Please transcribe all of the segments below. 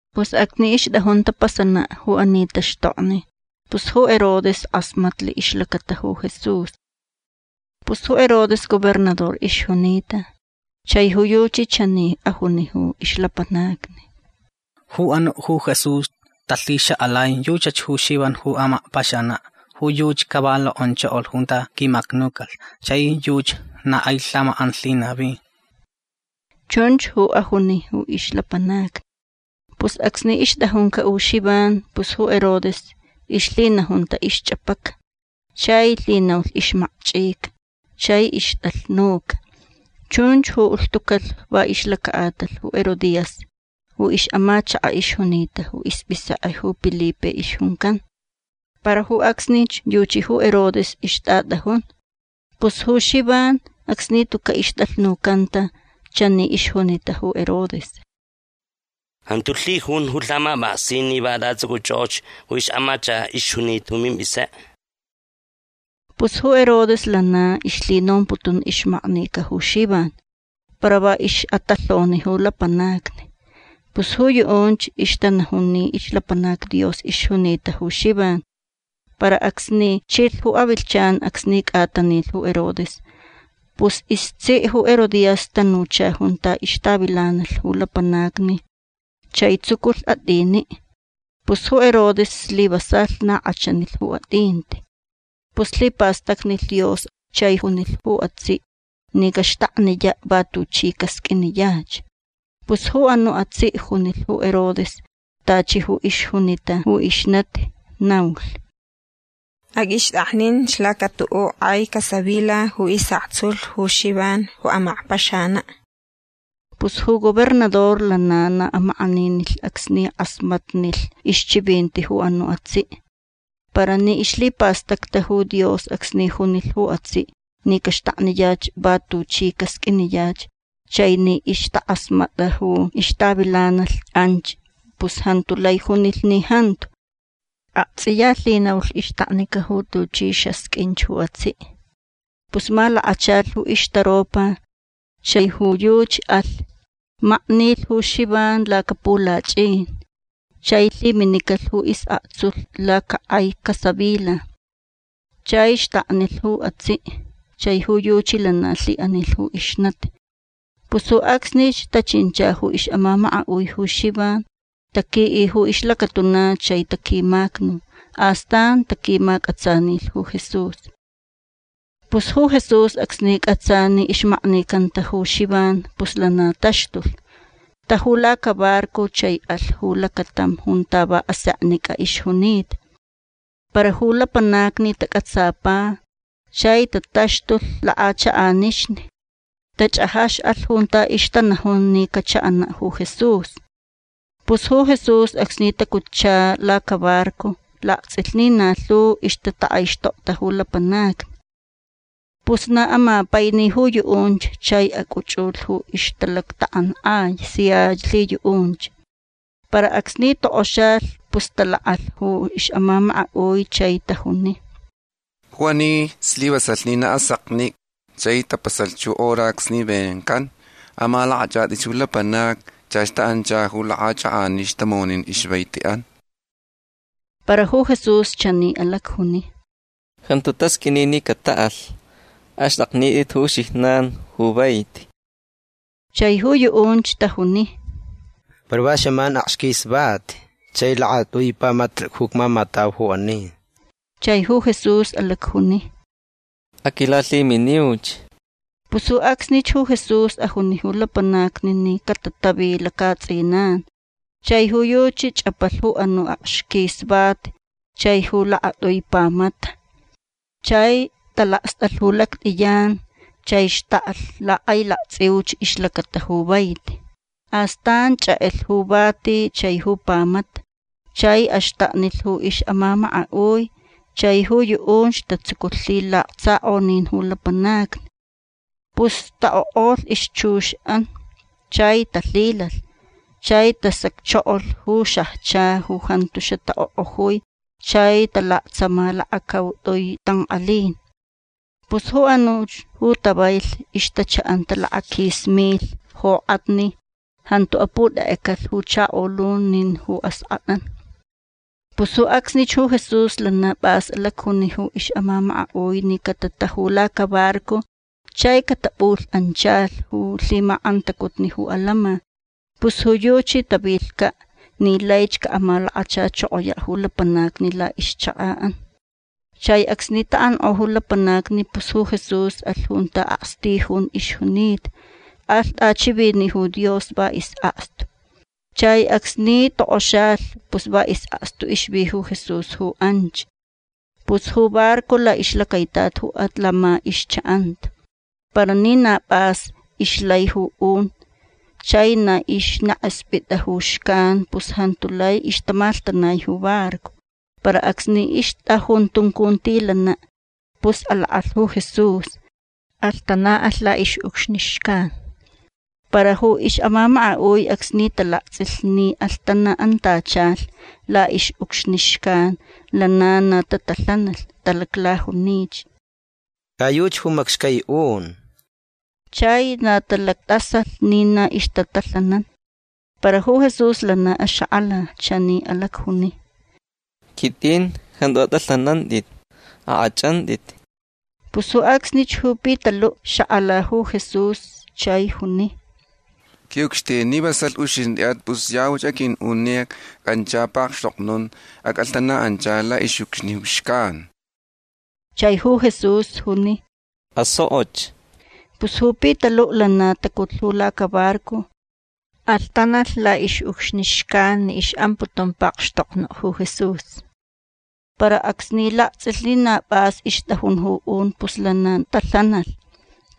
Pus acsni ixtʼajun tapasanaʼ ju ani taxtokni pus ju Herodes kʼasmatlh ixlacata ju Jesús. Pus ju Herodes gobernador ixjunita. Chai ju yuchi chani ajuni ju ixlapanacni: ―Ju anuʼ ju Jesús talhixakʼalai yuchach ju Xivan ju amakpaxanaʼ. Ju yuchi ca va lokʼonchokolh junta quimacnucalh chai yuchi na kʼai lhamakʼan lhinavi. ―Chunch ju ajuni ju ixlapanacni. Pus acsni ixtʼajuncaʼ ju Xivan pus ju Herodes ixlhinajunta ixchʼapaca. Chai lhinaulh ixmakchʼica chai ixtʼalhnuca. Chunch ju ulhtucalh va ixlacaʼatalh ju Herodías ju ixʼamachakaʼ ixjunita ju ispʼisekʼe ju Pilipe ixjuncan. Para ju acsnich yuchi ju Herodes ixtʼatʼajun. Pus ju Xivan acsni tucaʼ ixtʼalhnucanta chani ixjunita ju Herodes: ―Jantu lhijun ju lhamapʼaksin ni va atʼatsʼucʼuchʼokʼoch ju ixʼamachakaʼ ixjunita ju mimpʼisekʼe. Pus ju Herodes lana ixlhinomputun ixmaknica ju Xivan para va ixʼatalhoni ju lapanacni. Pus ju yuʼunch ixtanajun ni ixlapanac Dios ixjunita ju Xivan. Para acsni chilh ju avilhchan acsni cʼatanilh ju Herodes pus istsiʼ ju Herodías tanucha junta ixtavilanalh ju lapanacni chai tsuculh atʼiniʼ. Pus ju Herodes slivasalh na kʼachanilh ju atʼinti. Pus lhipastacnilh Dios chai junilh ju atsiʼ ni caxtakniyaʼ va tuchi casqʼuiniyach. Pus ju anuʼ atsiʼ junilh ju Herodes tachi ju ixjunita ju ixnati. Naulh: ―Aqʼuixtʼakninch laca tuʼuʼ kʼai casavila ju isʼaktsulh ju Xivan ju amakpaxanaʼ. Pus ju gobernador lana na amakʼaninilh acsni kʼasmatnilh ixchivinti ju anuʼ atsiʼ. Para ni ixlhipastacta ju Dios acsni junilh ju atsiʼ ni caxtakniyach va tuchi casqʼuiniyach chai ni ixtakʼasmatʼa ju ixtavilanalh anch pus jantu lai junilh ni jantu. Aktsʼiya lhinaulh ixtaknica ju tuchi xasqʼuinch ju atsiʼ. Pus malakachalh ju ixtaropa chai ju yuchi alh. Maknilh ju Xivan lacapulachʼin. Chai lhiminicalh ju isʼaktsulh lacakʼai casavila. Chai xtaknilh ju atsiʼ. Chai ju yuchi lana lhiʼanilh ju ixnati. Pus ju acsnich tachincha ju ixʼamamakaʼui ju Xivan. Taquiʼi ju ixlacatuna chai taquimacnu. Astan taquimacʼatsanilh ju Jesús. Pus ju Jesús acsni cʼatsa ni ixmaknicanta ju Xivan pus lana taxtulh. Taju lacabarco chai alh ju lacatam junta va aseknicʼa ixjunita. Para ju lapanacni tacʼatsapa chai tataxtulh lakʼachakʼanixni. Tachʼajaxʼalh junta ixtanajun ni cachaʼanaʼ ju Jesús. Pus ju Jesús acsni tacutcha lacabarco laktsʼilh ni na lhu ixtatakʼaixtokta ju lapanacni. Pus na amapaini ju yuʼunch chai acʼuchʼulh ju ixtalactakʼankʼai sia lhiyuʼunch. Para acsni tokʼoxalh pus talakʼalh ju ixʼamamakaʼui chai tajuni: ―Ju ani slivasalh ni na aseknicʼa chai tapasalh ju hora acsni vencan. Amalakʼachʼatʼi ju lapanacni. Chach taʼancha ju lakʼachakʼanixni tamonin ixvaitiʼan. Para ju Jesús chani alacjuni: ―Jantu tasqʼuini ni cataʼalh. Axtʼaknitʼit ju uxijnan ju vaiti. Chai ju yuʼunch tajuni: ―Para va xaman akxquis vati chai lakatʼui pamata ju icmamatau ju ani. Chai ju Jesús alacjuni: ―Aquilalhiminiuch. Pus ju acsnich ju Jesús ajuni ju lapanacni ni catatavi lacaʼatsʼinan. Chai ju yuchi chʼapalh ju anuʼ akxquis vati chai ju lakatʼui pamata. Chai talakstʼalh ju lactʼiyan chai xtaklh lakʼailaktsʼiuch ixlacata ju vaiti. Astan chʼekʼelh ju vati chai ju pamata. Chai axtaknilh ju ixʼamamakaʼui. Chai ju yuʼunch tatsuculh lhilaksakʼonin ju lapanacni. Pus taʼokʼolh ixchuxʼan chai talhilalh. Chai tasacchokolh ju xajcha ju jantu xataʼokʼojui chai talaktsama lakacautʼui tankʼalin. Pus ju anuch ju tavailh ixtachaʼanta lakaquis milh jokʼatni. Jantu aputʼekʼecalh ju chakolun nin ju askʼatʼan. Pus ju acsnich ju Jesús lana pʼas alacjuni ju ixʼamamakaʼui ni catataju lacabarco chai catapʼulhʼanchalh ju lhimakʼantacutni ju atantsʼin. Pus ju yuchi tavilhcaʼ ni laich caʼamalakachachokoyaʼ ju lapanacni laʼixchakaʼan. Chai acsni taʼankʼo ju lapanacni pus ju Jesús alh junta akstijun ixjunita. Alh tʼachiviniʼ ju Dios va isʼakstu. Chai acsni tokʼoxalh pus va isʼakstu ixvi ju Jesús ju anch. Pus ju barco laʼixlacaitat ju atantsʼin ixchaʼanta. Para ni na pʼas ixlai ju un chai na ixnekʼespʼit ju xcan pus jantu lai ixtamalhtanai ju barco. Para acsni ixtʼajun tuncuntilanaʼ pus alakʼalh ju Jesús. Alhtanaʼalh laʼixʼucxni xcan. Para ju ixʼamamakaʼui acsni talaktsʼilh ni alhtanaʼantachalh laʼixʼucxni xcan lana na tatalhanalh. Talaclajunich: ―Ca yuchi ju macxcai un. Chai na talactʼasalh ni na ixtatalhanan. Para ju Jesús lana axakʼala. Chani alacjuni: ―Quitʼin. Jantu atʼalhanantʼit. Akʼachʼantʼit. Pus ju acsnich ju Pitaluʼ xakʼala ju Jesús chai juni: ―Quiʼucxtin ni vasalh uxintʼiʼat pus yauch aqʼuiʼun ni acʼanchan pakxtoknun. Acʼalhtanaʼanchalh laʼixʼucxni xcan. Chai ju Jesús juni: ―Asokʼoch. Pus ju Pitaluʼ lana tacutlh ju lacabarco. Alhtanalh laʼixʼucxni xcan ni ixʼamputun pakxtoknuʼ ju Jesús. Para acsni laktsʼilh ni na pʼas ixtʼajun ju un pus lana talhanalh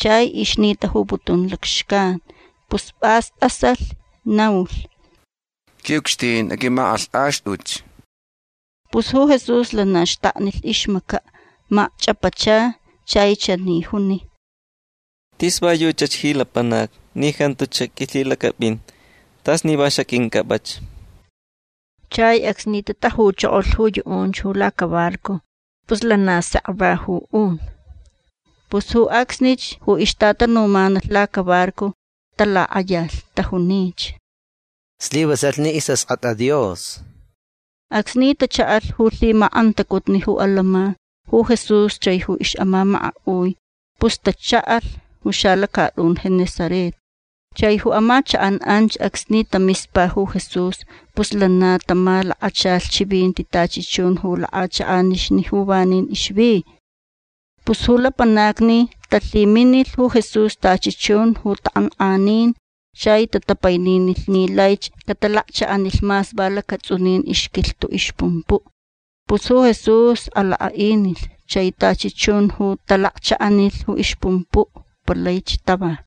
chai ixnitajuputun lacxcan. Pus pʼas tʼasalh. Naulh: ―Quiʼucxtin aqʼuimakʼalhtʼaxtʼuch. Pus ju Jesús lana xtaknilh ixmacaʼ. Macchʼapacha chai chani juni: ―Tis va yuchach ji lapanac ni jantuch quilhilacʼapʼin. Tas ni va xaqʼuincʼapʼach. Chai acsni tatajuchokolh ju yuʼunch ju lacabarco pus lana sek va ju un. Pus ju acsnich ju ixtatanumanalh lacabarco talakʼayalh. Tajunich: ―Slivasalh ni istsʼalhʼat Dios. Acsni tachaʼalh ju lhimakʼantacutni ju atantsʼin ju Jesús chai ju ixʼamamakaʼui pus tachaʼalh ju xalacatʼun Genesaret. Chai ju amachakʼan anch acsni tamispa ju Jesús pus lana tamalakachalh chivinti tachi chun ju lakʼachakʼanixni ju vanin ixvi. Pus ju lapanacni talhiminilh ju Jesús tachi chun ju takʼankʼanin. Chai tatapaininilh ni laich catalakchaʼanilh mas va lacatsʼunin ixquilhtuʼ ixpumpuʼ. Pus ju Jesús alakʼaʼinilh. Chai tachi chun ju talakchaʼanilh ju ixpumpuʼ palaich tava.